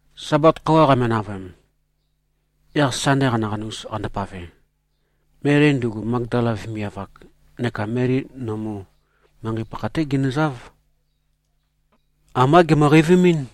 Sabat khøuwa qame-navøem, yaq Sande qanaqanus qandopave, Meli, ndugu Magdala vemiav-ak, neka Meli nømu, manqei pakha-té ginøzáv. Ambá gèmø-qeivimín.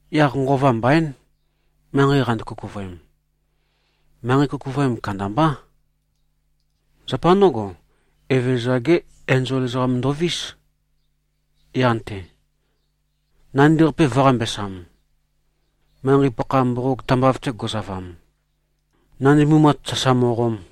Yaq nqova mbaín, manqei qando-kukuvøem. Manqei kukuvøem kandambá. Zapa ndǿgo, Evezøza-gé enzol ezoqam ndovís, yan-te, nandi-qape vø̄-qambesam, manqei-pakha mboqog tambav-te go꞉zavam, nandi mumat sasa mo꞉qom.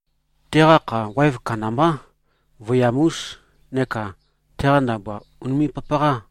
Teqa kha waev kandambá, vøiyam-ús, neka teqa ndabua ùnime꞉-papaqá.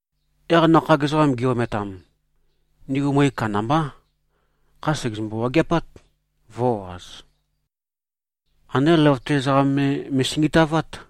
Yaq nakhag ezoqam gi-ometam, ndigu møe kandambá. Kha sègezømbu-wageapát, vø̄-o꞉az. Andé løvøte ezoqam me me꞉singitavát.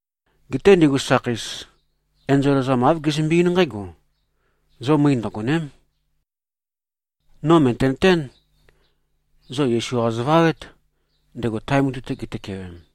Geté ndigu sakheis, enzol ezoqam āv gezømbe-eín nqǽgo, “Zo møe ndøgòne᷄m. No mø̀tenøtén. Zo Yesu-qa zovawét, ndego tae mutui-te gitøkewem.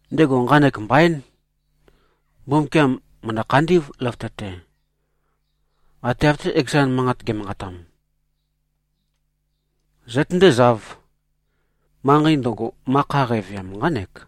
Ndego nqanek mbaín. Mbumbukiam mø̀ndø-khandí꞉v, løvøte-te. Ate av-té, ekezan manqat ge꞉manqatam. Zøtøndézāv. Manqei ndøgo, ma kha qæveam, nqánek.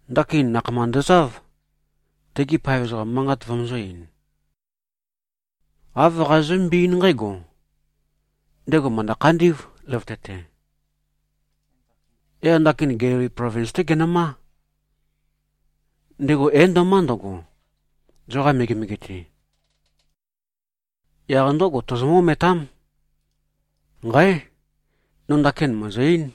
Ndakin nakhama ndøzáv, tegi paev ezoqam manqat vømøzø̄-ein. Āv qazozømbé-eín nqǽgo, ‘Ndego mø̀ndø-khandí꞉v, løvøte-te. Yaq ndakin Gelili plovins-té genømá. Ndego é-ndo꞉má ndøgo, zoqa megemege-te. Yaq ndǿgo, tozomǿ-ometám.’ Nqáe! No ndakin mø̀ezø-eín.”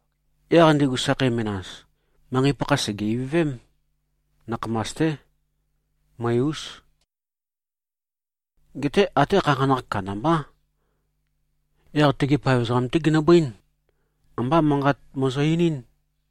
Yaq ndigu sakhei menas, manqei-pakha sège-ivøvém. Nakhamas-té. Møe-ús. Geté até khanakhanakh kandambá. Yaq tegi paev ezoqam-té ginøbøín. Ambá manqat møzø-einín.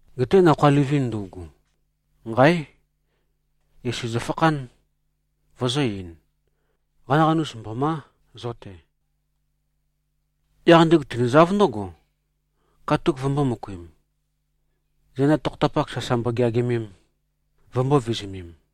Geté nakhoa livin ndøugu, nqáe! Yesu zøfakhán, vøzø̄-ein, “Qanaqanus mbomá, zo-te!” Yaq ndigu tinøzáv ndǿgo, katuk vømbō-møkuim, zenda tokhotapak sasa mbogeagimem, vømbō-vizumem.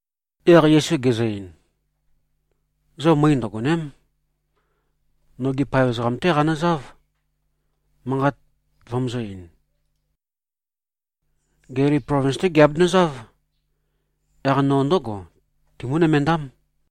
Yaq Yesu gezø-ein, “Zo møe ndøgòne᷄m. Nogi paev ezoqam-té qanøzáv, manqat vømøzø̄-ein. Gelili plovins-té giabenøzáv. Yaq no ndǿgo timǿ-nømendám.”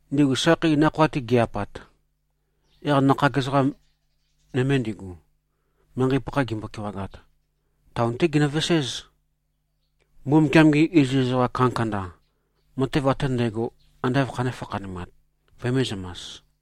Ndigu sakheis nakhoa-te gi꞉-apat, yaq nakhag ezoqa nøme ndigu, manqei-pakha gimbo-kewagat, taon-té ginøveséz, Mbumbukiam-gi iziz ezoqa kandakanda, matev ate ndægo, ande āv khanē-fakhanumat, vømēzømas.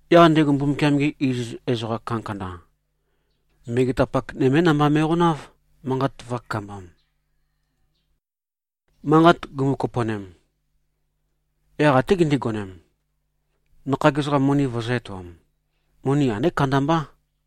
Yaq ndigu Mbumbukiam-gi iziz ezoqa kandakanda, megetapak nømé namba me꞉qonáv, manqat vø̄kakambam. Manqat gumu-kopo꞉nem, yaq até gindigonem, nakhag ezoqam moni vøzø̄-etoam. Moni andé kandambá.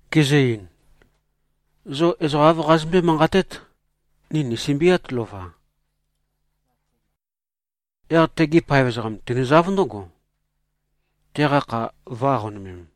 Gizø-ein, “Zo ezoqa āv qazozømbé-manqatét, ‘Ni nìsømbiát, lova. Yaq tegi paev ezoqam tinduzáv ndǿgo, teqa kha vø̄-aqonømem.’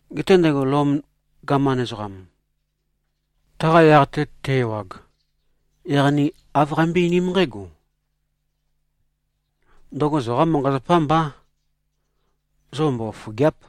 Geté ndego Lom gaman ezoqam, taqa yaq-te te-ewag, yaq ni āv qeimbøé-einím nqǽgo: Ndøgo zoqá manqa-zapá mbá. Zo mbofofògea᷄p.”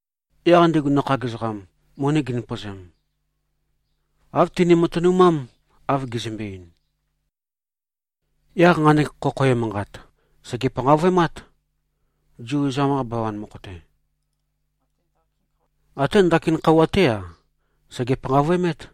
Yaq ndigu nakhag ezoqam, moni gindøpøzem, āv tini-matønumám, av gizømbe-ein. Yaq nqanek khokho emanqat, sège-panqavøemát, Zu ezoqam-qa bawan mokho-te. Até ndaki khøuwa-té-a, sège-panqavøemét.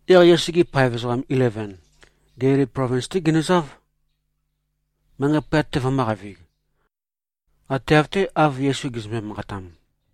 Yaq Yesu-gi paev ezoqam ileven, Gelili plovins-té ginøzáv, manqei pøyat-te vømø̄qavig. Ate av-té, av Yesu gezømbe-manqatam.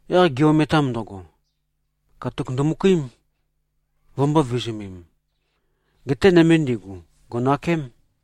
Yaq gi-ometam ndøgo, katuk ndømøkuím, vømbō-vizumem. Geté nøme ndigu, gò꞉nakém.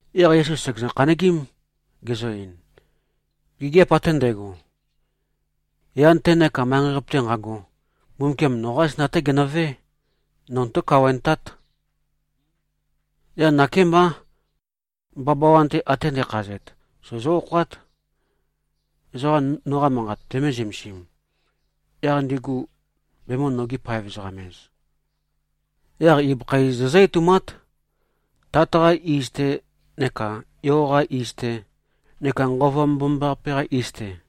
Yaq Yesu sègezø-khanøgím, gezø-ein, “Gigiap ate ndægo, yan-te neka manqei-qape-te nqago, Mbumbukiam noqá zenda-té genøvé. No notó-kawaentát. Yaq nakémbá. Bawabawan-te ate ndækhazet, sozó-okhoát, ezoqa noqa manqat vømē-zømesim, yaq ndigu bemø̄-nogi-paev-ezoqam-ez. Yaq ibøkha iz zozǿ-etoumát, Tat-qā iz-tē, neka Yo-qā iz-tē, neka Nqova Mbomambaqape-qā iz-tè.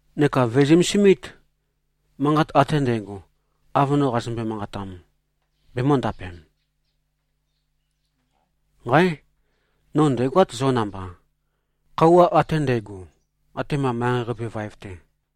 Neka vø̀e-zømesimít. Manqat ate ndægo, av no qazømbe-manqatam, bemø̄ndapem. Nqáe! No ndæ̀goát zo namba, khøuwa ate ndægo, atema manqei-qape vaev-te.”